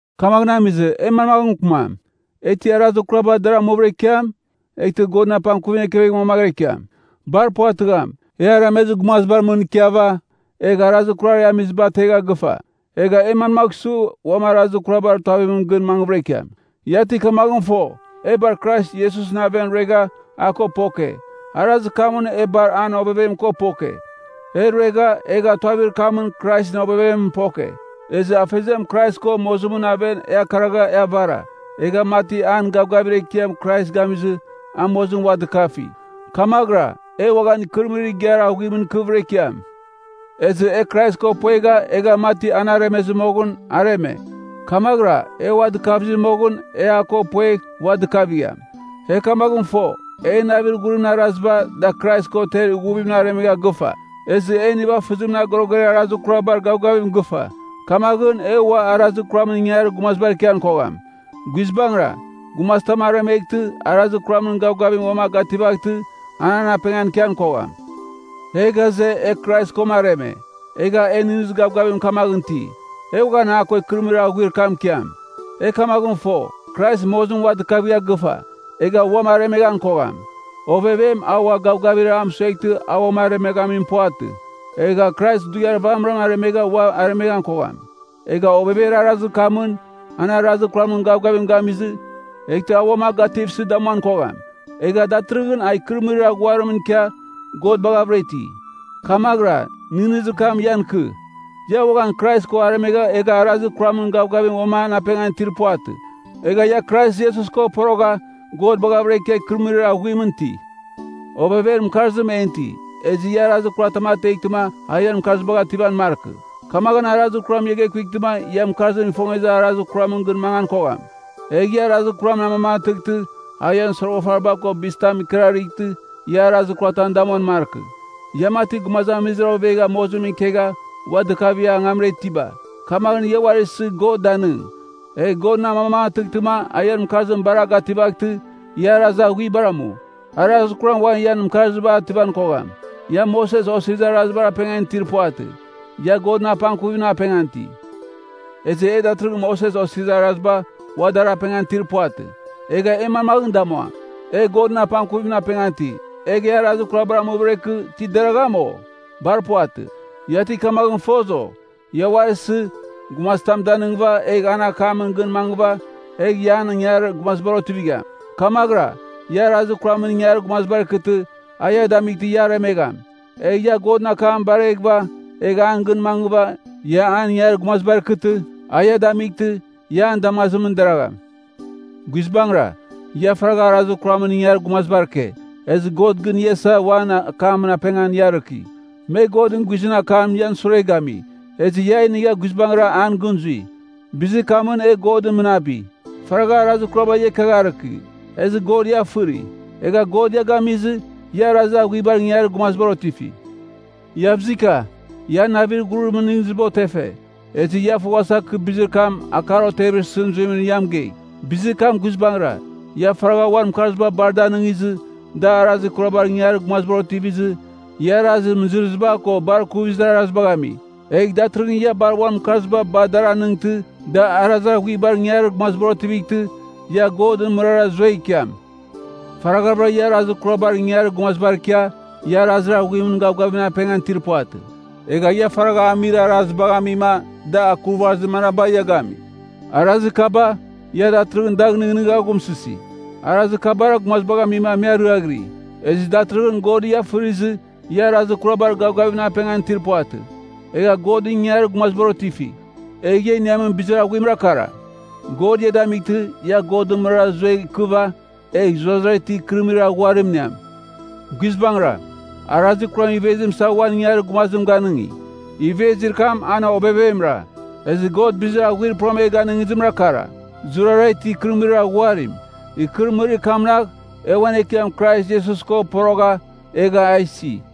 Kamaghɨn amizɨ, e manmaghɨn mɨkɨmam? E ti arazir kuraba dar amuvɨra ikiam, eghtɨ Godɨn apangkuvim ekevegh mangvɨra ikiam? Bar puvatɨgham! E aremezir gumazibar mɨn ikiava, egha arazir kurar e amiba ategha gɨfa. Egh e manmagh su, uam arazir kurabar tuavimɨn gɨn mangvɨra ikiam? Ia ti kamaghɨn fo, e bar Krais Iesusɨn aven ruegha a ko poke. Arazir kamɨn e bar an ovevem ko poke. E ruegha, egha tuavir kamɨn Kraisɨn ovevemɨn poke, ezɨ Afeziam Krais ko mozimɨn aven e akaragha e avara. Egha mati an gavgavir ekiam Krais gamizɨ a mozimɨn ua dɨkafi, kamaghɨra, e uaghan ikɨrɨmɨrir igiar aghuimɨn ikɨvɨra ikiam. Ezɨ, e Krais ko puegha egha mati an aremezɨ, moghɨn areme. Kamaghɨra, e a ua dɨkavizɨ moghɨn e a ko puegh ua dɨkavigham. E kamaghɨn fo, en navir ghurimɨn araziba, da Krais ko ter ighuvimɨn aremegha gɨfa, ezɨ en nivafɨzimɨn agoroger arazir kurabar gavgavim gɨfa. Kamaghɨn, e ua arazir kuramɨn ingangarir gumazibar ikian kogham. Guizbangɨra, gumazitam aremeghtɨ, arazir kuramɨn gavgavim uam a gativaghtɨ, an an apengan ikian kogham. E ghaze, e Krais ko areme, egha e nɨghnɨzir gavgavim kamaghɨn iti, e uaghan a ko ikɨrɨmɨrir aghuir kamɨn ikiam. E kamaghɨn fo, Krais mozimɨn ua dɨkavigha gɨfa. Egha uam aremeghan kogham. Ovevem, a ua gavgavir a mɨsueghtɨ a uam aremeghamim, puvatɨ. Egha Krais dughiar vamɨram aremegha ua aremeghan kogham. Egha ovever arazir kamɨn, an arazir kuramɨn gavgavim gamizɨ, eghtɨ a uam a gativsɨ damuan kogham. Egha datɨrɨghɨn a ikɨrɨmɨrir aghuarimɨn ikia God baghavɨra iti. Kamaghɨra, nɨghnɨzir kam ian ikɨ, ia uaghan Krais ko aremegha egha arazir kuramɨn gavgavim uam an apengan itir puvatɨ. Egha ia Krais Iesus ko porogha God baghavɨra ikia ikɨrɨmɨrir aghuimɨn iti. Ovever mɨkarzim en iti, ezɨ ia arazir kuram ateghtɨma a ian mɨkarzibagh ativan markɨ. Kamaghɨn arazir kuram ia gekutɨma ia mɨkarzim ifongezir arazir kuramɨn gɨn mangan kogham. Egh ia arazir kuram amamangatɨghtɨ a ian soroghafariba ko bizitaba ikɨrarɨghtɨ ia arazir ikuratam damuan markɨ. Ia mati, gumazamizir ovegha mozimɨn ikegha ua dɨkavigha angamra itiba, kamaghɨn ia uari isɨ God danɨng. Egh God amamangatɨghtɨma a ian mɨkarzim bar a gativaghtɨ ia arazir aghuibar amu. Arazir kuram ua ian mɨkarzibagh ativan kogham. Ia Moses Osirizir Arazibar apengan itir puvatɨ, ia Godɨn apangkuvimɨn apengan iti. Ezɨ e datɨrɨghɨn Moses Osirizir Araziba ua dar apengan itir puvatɨ, egh e manmaghɨn damuam? E Godɨn apangkuvimɨn apengan iti, egh e arazir kurabar amuvɨra ikɨ, ti deragham, o? Bar puvatɨ! Ia ti kamaghɨn fos, o? Ia uari isɨ, gumazitam a danɨngɨva, egh an akamɨn gɨn mangɨva, egh ia an ingangarir gumazibar otivigham. Kamaghɨra, ia arazir kuramɨn ingangarir gumazibar ikɨtɨ, a ia damightɨ ia aremegham. Egh ia Godɨn akam bareghɨva egh an gɨn mangɨva, ia an ingangarir gumazibar ikɨtɨ, a ia damightɨ, ia an damazimɨn deragham. Guizbangɨra, ia faragha arazir kuramɨn ingangarir gumazibar ike, ezɨ God gɨn ia isa, uan akamɨn apengan ia arɨki. Me Godɨn guizɨn akam ian sure gami, ezɨ ia a inigha guizbangɨra an gɨn zui. Bizir kamɨn, e God mɨnabi! Faragha arazir kuraba ia ikiagharɨki, ezɨ God ia fɨri. Egha God ia gamizɨ, ia arazir aghuibar ingangarir gumazibar otifi. Iavzika. Ian navir ghuribar nɨghnɨziba otefe, ezɨ ia foghasa kɨ bizir kam akar otevir isɨn zuimɨn ia mɨgei. Bizir kam guizbangɨra, ia faragha uan mɨkarziba bar da anɨngizɨ, da arazir kurabar ingangarir gumazibar otivizɨ, ia arazir mɨzɨrɨziba ko bar ikuvizir arazibagh ami. Egh datɨrɨghɨn ia bar uan mɨkarziba bar dar anɨngtɨ, da arazir aghuibar ingangarir gumazibar otivightɨ, ia Godɨn mɨrara zuegh ikiam. Faragha ia arazir kurabar ingangarir gumazibar ikia, ia arazir aghuimɨn gavgavimɨn apengan itir puvatɨ. Egha ia faragha amir arazibagh amima da akurvazir manaba ia gami? Arazir kaba, ia datɨrɨghɨn dagh nɨghnɨghava aghumsɨsi. Arazir kabara gumazibagh amima me ariaghiri. Ezɨ datɨrɨghɨn God ia fɨrizɨ, ia arazir kurabar gavgavimɨn apengan itir puvatɨ, egha Godɨn ingangarir gumazibar otifi. Egh ia iniamin bizir aghuimra kara, God ia damightɨ, ia Godɨn mɨrara zuegh ikɨva, egh zurara itir ikɨrɨmɨrir aghuarim iniam. Guizbangɨra, arazir kuram ivezim isava uan ingangarir gumazim ganɨngi. Ivezir kam an ovevemra. Ezɨ God bizir aghuarir pura e ganɨngizimra kara, zurara itir ikɨrɨmɨrir aghuarim. Ikɨrɨmɨrir kamnagh, e uan Ekiam Krais Iesus ko porogha, egha a isi.